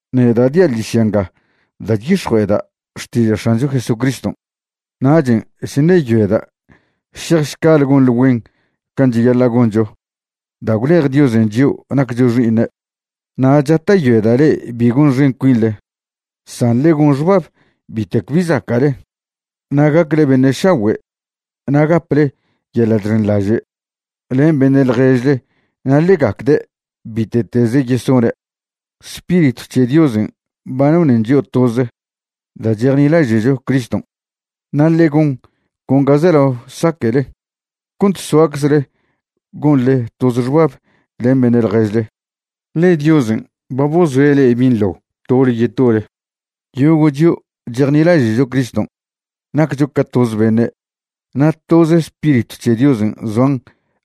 Neda' dia' ḻižya nga da' chyix̱jue'eda' xtiža' X̱ancho Jesucriston'. Nachen' chṉeyoeda' šejšcale gonḻe güen can' cheyaḻa' goncho da' gwlej Diosen' chio' naccho xi'iṉe'. Na' chata'yoeda' le'e bi gonxen cuinḻe, san ḻe gon xbab bitec bi zaca'le; na' gacle beṉe' šagüe' na' gaple yeḻa' chxenḻaže' len beṉe' ḻježle na' ḻe gacde' bite'teze yesone'. Spiritw c̱he Diosen' ba nonen chio' toze da' chejnilaže'cho Criston', na' ḻe gon con ga zelao saque'le cont soaczle gonḻe toze xbab len beṉe' ḻježle, ḻe Diosen' ba bozoe' le'e binḻo tole yetole. Yogo' chio' chejnilaže'cho Criston' naccho ca toz beṉe', na' toz Spiritw c̱he Diosen' zoan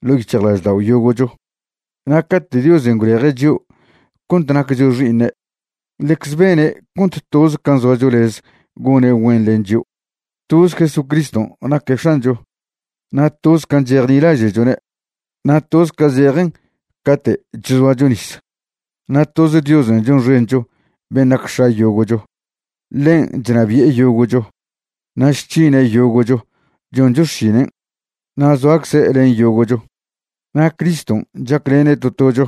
ḻo' yic̱hjlaždao' yogo'cho. Na' cate' Diosen' gwleje' chio' cont naccho xi'iṉe', ḻecze bene' cont toz can' zoacho lez gone' güen len chio'. Toz Jesucriston' naque' X̱ancho, na' toz can' chejnilaže'chone', na' toz ca zejen cate' chzoacho nis. Na' toz Diosen' chonxencho ben' nac X̱a yogo'cho. Ḻen' chnabi'e yogo'cho, na' chc̱hine' yogo'cho choncho xšinen', na' zoacze' len yogo'cho. Na' Criston' chaclene' to tocho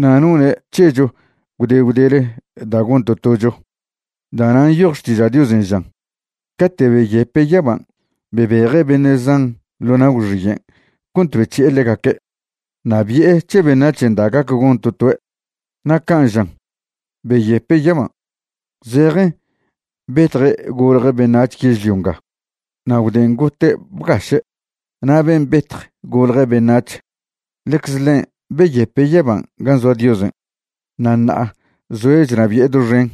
na' none' c̱hecho gwde gwdele da' gon to tocho. Da'nan' nyoj Xtiža' Diosen' žan: Cate' beyepe' yaban' bebeje' beṉe' zan ḻo na' gwxiyen' cont bec̱hi'e ḻegaque'. Na' bi'e c̱he beṉac̱hen' da' gac gon to toe'. Na' can' žan: “Beyepe' yaban'”, zejen betje' golje' beṉac̱h yežlio nga na' gwden' gote' bgaše'. Na' ben' betj golje' beṉac̱h, ḻecze ḻen' beyepe' yaban' gan' zoa Diosen', na' ṉa'a zoe' chnabi'e doxen.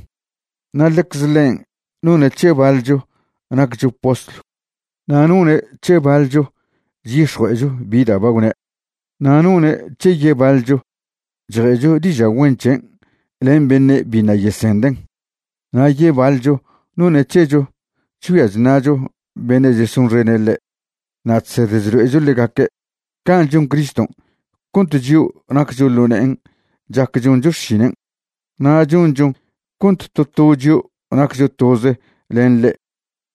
Na' ḻecze ḻen' none' c̱he baḻcho naccho postlw, na' none' c̱he baḻcho chyix̱jue'echo bi da' ba gwne', na' none' c̱he yebaḻcho chje'cho diža' güen c̱hen' len beṉe' biṉa' yesenden', na' yebaḻcho none' c̱hecho chgüia chṉa'cho beṉe' chesonxene' ḻe' na' chsed chlo'echo ḻegaque'. Can' chon Criston' cont chio' naccho ḻo ne'en chac choncho xšinen'. Na' chonchon cont to to chio' naccho toze len ḻe'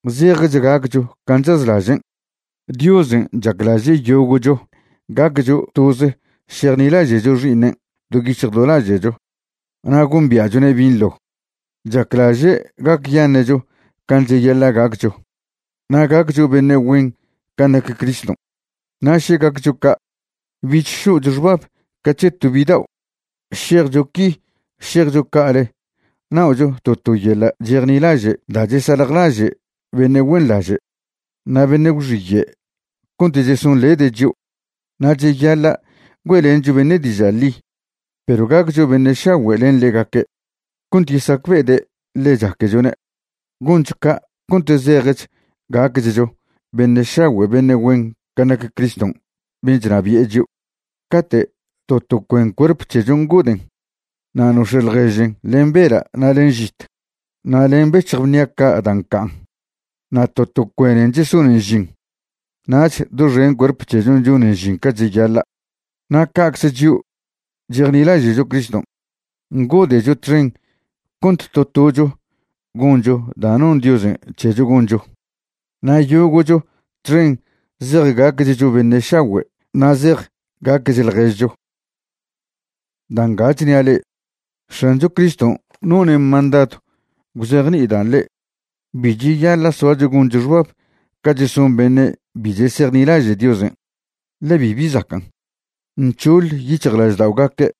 zejech gacchcho can' chazlažen'. Diosen' chaclaže' yogo'cho gaccho toze šejnilaže'cho Xi'iṉen' do yic̱hj do laže'cho na' gombia'chone' binḻo. Chaclaže' gacyaṉe'cho can' cheyaḻa' gaccho, na' gaccho beṉe' güen can' nac Criston'. Na' še gaccho ca', bich šo'cho xbab ca c̱he to bidao', šejcho qui šejcho ca'ale na'ocho to to yeḻa' chejnilaže' da' chesaljlaže' beṉe' güenḻaže' na' beṉe' gwxiye' cont chesonḻede' chio'. Na' cheyaḻa' güe'lencho beṉe' diža' ḻi, perw gaccho beṉe' šagüe' len ḻegaque' cont yesacbe'ede' ḻe chaquechone'. Goncho ca' cont zejech gacchcho beṉe' šagüe' beṉe' güen can' nac Criston' ben' chnabi'e chio'. Cate' to to cuen cuerp c̱hechon' ngoden' na' nox̱e' ḻježen len bela' na' len žit na' len bec̱hj bnia ca' da' ncan', na' to to cuenen chesonen ž'in, nach doxen cuerp c̱hechon' chonen žin ca cheyaḻa'. Na' ca'cze chio' chejnilaže'cho Criston' ngode'cho txen cont to tocho goncho da' non Diosen' c̱hecho goncho, na' yogo'cho txen zej gacchcho beṉe' šagüe' na' zej gaquech ḻježcho. Da' nga chnia' le'e, X̱ancho Criston' none' mandadw gwzejni'idan' le'e: bi cheyaḻa' soacho goncho xbab ca cheson beṉe' bi chesejnilaže' Diosen', ḻe bibi zacan'. Nc̱hoḻ yic̱hjlažda'ogaque'.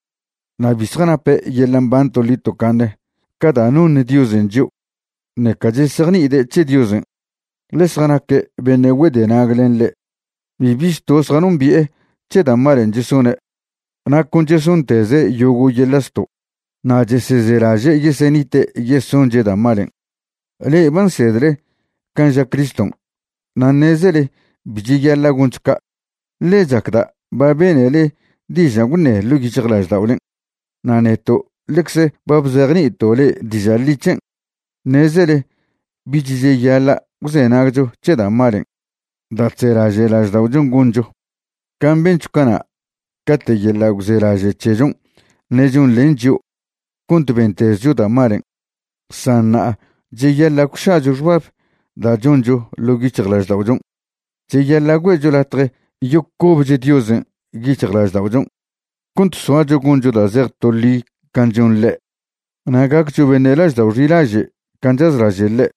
Na' bi zjanape' yeḻa' mban toḻi tocaṉe ca da' noṉ Diosen' chio', ṉeca chesejni'ide' c̱he Diosen', ḻe zjanaque' beṉe' güedenag len ḻe'. Bibi zto' zjanombi'e c̱he da' malen' chesone', na' con chesonteze' yogo' yeḻa' zto', na' chesezelaže' yesenite' yesonche' da' malen'. Le'e ba nsedle can' ža Criston' na' ṉezele bi cheyaḻa' goncho ca', ḻe chacda' ba benele dižan' gwṉe' ḻo' yic̱hjlažda'olen', na' neto' ḻecze ba bzejni'ito' le'e diža' ḻi c̱hen'. Ṉezele bich cheyaḻa' gwzenagcho c̱he da' malen' da' chzelaže' lažda'ochon' goncho, can' bencho cana' cate' yeḻa' gwzelaže' c̱hechon' ṉe' chonḻen chio' cont bentezcho da' malen'. San ṉa'a cheyaḻa' gwša'cho xbab da' choncho ḻo' yic̱hjlažda'ochon'. Cheyaḻa' güe'cho latje yocobech Diosen' yic̱hjlažda'ochon' cont soacho goncho da' zej to ḻi can' chon ḻe', na' gaccho beṉe' laždao' xilaže' can' chazlaže' ḻe'.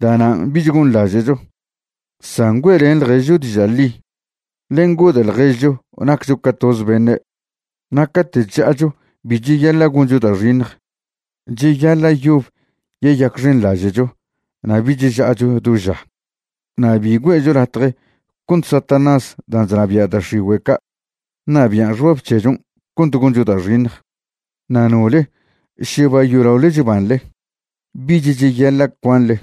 Da'nan' bich gonḻaže'cho, san güe'len ḻježcho diža' ḻi, ḻe ngode' ḻježcho naccho ca toze beṉe'. Na' cate' chža'acho bi cheyaḻa' goncho da' xiṉj. Cheyaḻa' yob yeyacxenḻaže'cho na' bich ža'acho do ža. Na' bi güe'cho latje cont Satanás dan' chnabia' da' x̱igüe' ca' ṉabian' xbab c̱hechon' cont goncho da' xiṉj. Na' nole še ba yolaole chbanḻe, bich cheyaḻa' cuanḻe.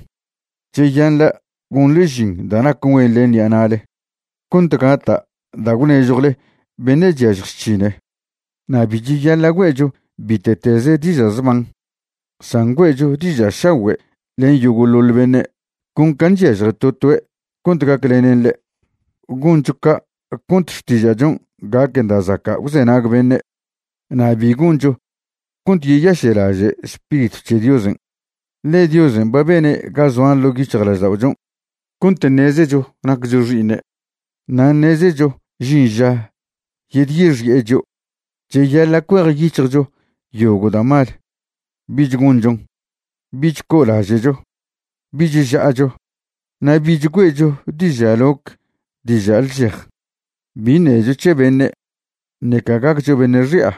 Cheyaḻa' gonḻe žin da' nac güen len ṉi'a na'le cont gata' da' gwnežjwle beṉe' chyažj chc̱hine. Na' bi cheyaḻa' güe'cho bite'teze diža' zban, san güe'cho diža' šagüe' len yogo'ḻoḻ beṉe', con can' chyažje to toe' cont gaclenen ḻe'. Goncho ca' cont xtiža'chon' gaquen da' zaca' gwzenag beṉe'. Na' bi goncho cont yeyaše'laže' Spiritw c̱he Diosen', ḻe Diosen' ba bene' ga zoan ḻo' yic̱hjlažda'ochon' cont ṉezecho naccho xi'iṉe' na' ṉezecho žin ža yedyexi'e chio'. Cheyaḻa' cuejyic̱hjcho yogo' da' mal, bich gonchon. Bich co'olaže'cho, bich ža'acho, na' bich güe'cho diža' loc diža' lžej. Bi ṉecho c̱he beṉe', ṉeca gaccho beṉe' xi'a.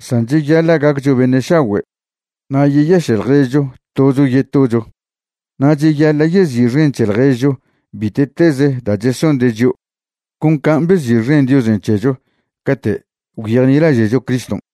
San cheyaḻa' gaccho beṉe' šagüe' na' yeyaše' ḻježcho tocho yetocho. Na' cheyaḻa' yezi'xen c̱he ḻježcho bite'tez da' chesonde' chio' con can' bezi'xen Diosen' c̱hecho cate' gwyejnilaže'cho Criston'.